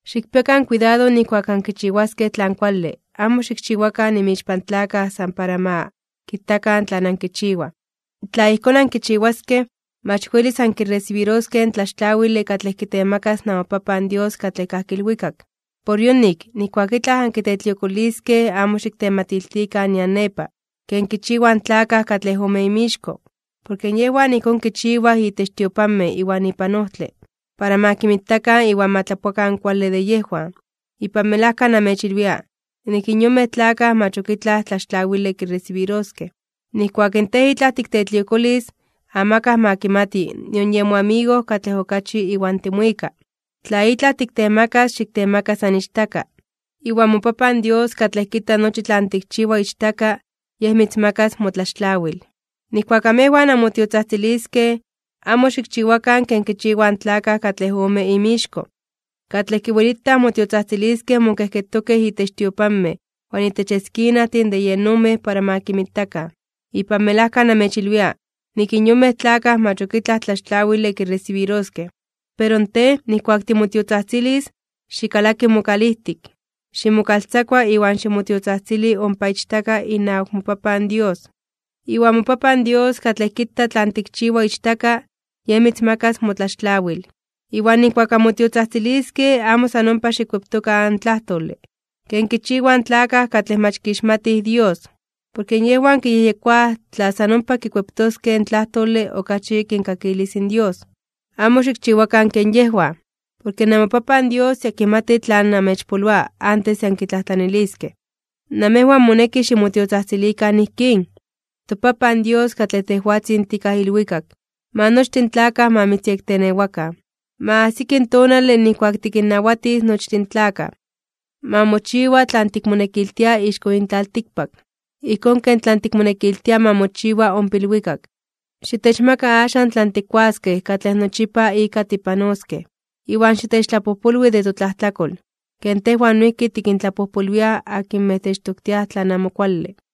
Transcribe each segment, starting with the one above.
’Xikpiakan kuidado nijkuak ankichiwaskej tlan kuale, amo xikchiwakan inmixpan tlakaj san para ma kitakan tlan ankichiwaj. Tla ijkón ankichiwaskej, mach welis ankiresibiroskej in tlaxtlawile katlej kitemakas namoPapan Dios katlej kajki ilwikak. ’Por yonik, nijkuak itlaj ankitetliokoliskej amo xiktematiltikan nian nepa, ken kichiwaj in tlakaj katlej ome inmixko. Porke yejwan ijkón kichiwaj itech tiopanmej iwan ipan ojtle, para ma kinmitakan iwan ma tlapoakan kuale de yejwan. Ipan melajka namechilwia, nik in yonmej tlakaj mach ok itlaj tlaxtlawile kiresibiroskej. Nijkuak in tej itlaj tiktetliokolis, amakaj ma kimati nion yen moamigo katlej okachi iwan timuika. Tla itlaj tiktemakas xiktemaka san ichtaka. Iwan moPapan Dios katlej kita nochi tlan tikchiwa ichtaka, Yej mitzmakas motlaxtlawil. ’Nijkuak amejwan anmotiotzajtziliskej, amo xikchiwakan ken kichiwaj in tlakaj katlej ome inmixko, katlej kiwelitaj motiotzajtziliskej mokejketokej itech tiopanmej iwan itech eskinajtin de yen ojmej para ma kinmitakan. Ipan melajka namechilwia, nik in yonmej tlakaj mach ok itlaj tlaxtlawile kiresibiroskej. Pero tej, nijkuak timotiotzajtzilis, xikalaki mokalijtik, ximokaltzakua iwan ximotiotzajtzili ompa ichtaka inawak moPapan Dios. Iwan moPapan Dios katlej kita tlan tikchiwa ichtaka, Yej mitzmakas motlaxtlawil. ’Iwan nijkuak anmotiotzajtziliskej amo san ompa xikkueptokan in tlajtole, ken kichiwaj in tlakaj katlej mach kixmatij Dios, porke yejwan kiyejyekoaj tla san ompa kikueptoskej in tlajtole okachi kinkakilis in Dios. Amo xikchiwakan ken yejwan, porke namoPapan Dios ya kimati tlan namechpoloa antes de ankitlajtlaniliskej. Namejwan moneki ximotiotzajtzilikan ijkín: ToPapan Dios katlej tejwatzin tikaj ilwikak, Ma nochtin in tlakaj ma mitzyektenewakan. Ma ajsiki in tonale nijkuak tikinnawatis nochtin in tlakaj. Ma mochiwa tlan tikmonekiltia ixko yin tlaltikpak, ijkón ken tlan tikmonekiltia ma mochiwa ompa ilwikak. Xitechmaka axan tlan tikkuaskej katlej nochipa ika tipanoskej. Iwan xitechtlapojpolwi de totlajtlakol, ken tejwan noijki tikintlapojpolwiaj akinmej techtoktiaj tlan amo kuale.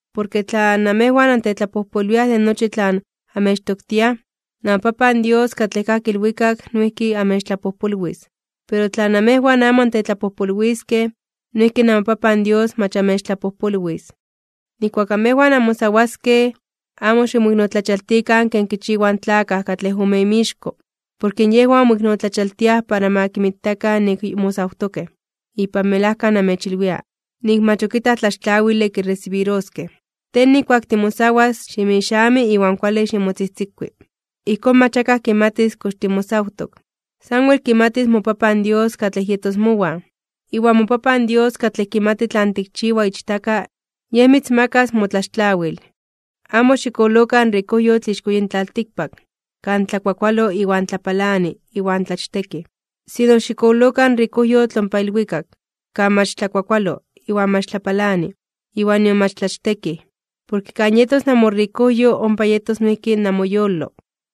’Porke tla namejwan antetlapojpolwiaj de nochi tlan amechtoktiaj, namoPapan Dios katlej kajki ilwikak noijki amechtlapojpolwis. Pero in tla namejwan amo antetlapojpolwiskej, noijki namoPapan Dios mach amechtlapojpolwis. ’Nijkuak amejwan anmosawaskej, amo ximoiknotlachaltikan ken kichiwaj in tlakaj katlej ome inmixko, porke yejwan moiknotlachaltiaj para ma kinmitakan nik mosawtokej. Ipan melajka namechilwia, nik mach ok itlaj tlaxtlawile kiresibiroskej. Tej nijkuak timosawas, ximixami iwan kuale ximotzijtzikui. Ijkón, mach akaj kimatis kox timosawtok, sanwel kimatis moPapan Dios katlej yetos mowan, iwan moPapan Dios katlej kimati tlan tikchiwa ichtaka, Yej mitzmakas motlaxtlawil. ’Amo xikololokan rikojyotl ixko yin tlaltikpak, kan tlakuakualo iwan tlapalani, iwan tlachtekij. Sino xikololokan rikojyotl ompa ilwikak, kan mach tlakuakualo, iwan mach tlapalani, iwan nion mach tlachtekij. Porke kan yetos namorikojyo, ompa yetos noijki namoyolo.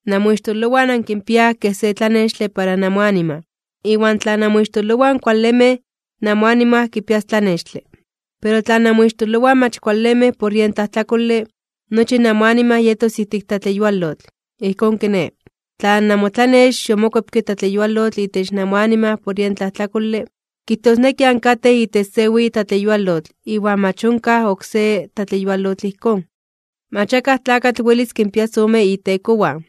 ’Namoixtololowan ankinpiaj kej se tlanextle para namoanima, iwan tla namoixtololowan kualemej, namoanima kipias tlanextle. Pero in tla namoixtololowan mach kualemej por yen tlajtlakole, nochi namoanima yetos ijtik tlatleyualotl. Ijkón kiné, tla namotlanex yomokuepke tlatleyualotl itech namoanima por yen tlajtlakole, kijtosneki ankatej itech se weyi tlatleyualotl iwan mach onkaj oksé tlatleyualotl ijkón. ’Mach akaj tlakatl welis kinpias ome itekowan,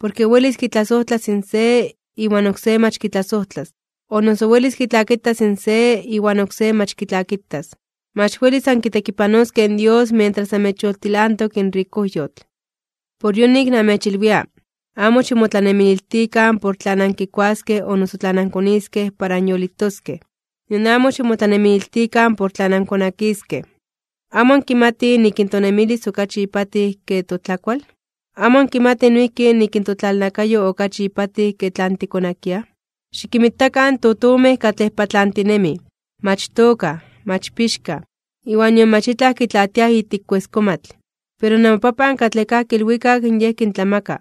porke welis kitlasojtlas in se iwan oksé mach kitlasojtlas, o noso welis kitlakitas in se iwan oksé mach kitlakitas. Mach welis ankitekipanoskej in Dios mientras amechyoltilantok in rikojyotl. ’Por yonik namechilwia, amo ximotlanemililtikan por tlan ankikuaskej o noso tlan ankoniskej para anyolitoskej, nion amo ximotlanemililtikan por tlan ankonakiskej. ¿Amo ankimatij nik in tonemilis okachi ipatij ke totlakual? ¿Amo ankimatij noijki nik in totlalnakayo okachi ipatij ke tlan tikonakiaj? Xikinmitakan in totomej katlej patlantinemij. Mach tookaj, mach pixkaj, iwan nion mach itlaj kitlaatiaj ijtik kueskomatl. Pero namoPapan katlej kajki ilwikak Yej kintlamaka.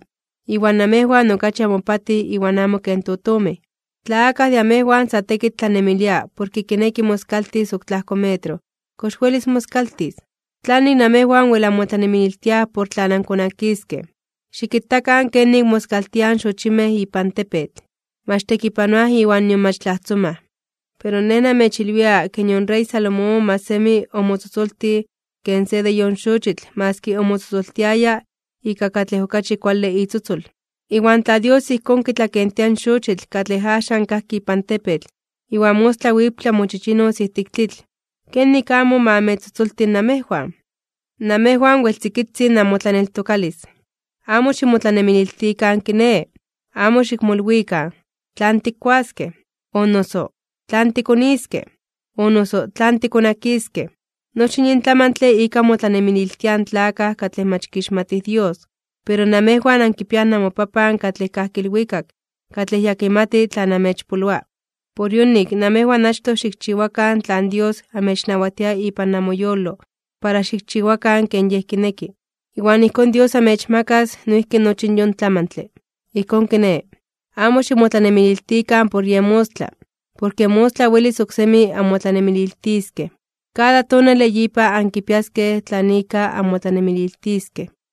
Iwan namejwan okachi amopatij iwan amo ken totomej. Tla akaj de amejwan sa tekitl tlanemilia porke kineki moskaltis ok tlajko metro, ¿kox welis moskaltis? ’¿Tlanik namejwan wel anmotlanemililtiaj por tlan ankonakiskej? Xikitakan kenik moskaltiaj in xochimej ipan tepetl. Mach tekipanoaj iwan nion mach tlajtzomaj. Pero Nej namechilwia ke nion rey Salomón mach semi omotzotzoltij ken se de yon xochitl maski omotzotzoltiaya ika katlej okachi kuale itzotzol. Iwan tla Dios ijkón kitlakentia in xochitl katlej axan kajki ipan tepetl iwan mostla wiptla mochichinos ijtik tlitl, ¿kenik amo ma amechtzotzolti namejwan? ¡Namejwan wel tzikitzin namotlaneltokalis! Amo ximotlanemililtikan kiné, amo xikmolwikan: “¿Tlan tikkuaskej? o noso ¿tlan tikoniskej? o noso ¿tlan tikonakiskej?” Nochi in yin tlamantle ika motlanemililtiaj in tlakaj katlej mach kixmatij Dios. Pero namejwan ankipiaj namoPapan katlej kajki ilwikak katlej ya kimati tlan amechpoloa. Por yonik, namejwan achtoj xikchiwakan tlan Dios amechnawatia ipan namoyolo para xikchiwakan ken Yej kineki. Iwan ijkón Dios amechmakas noijki nochi yon tlamantle. Ijkón kiné, amo ximotlanemililtikan por yen mostla, porke mostla welis oksemi anmotlanemililtiskej. Kada tonale yipa ankipiaskej tlan ika anmotlanemililtiskej.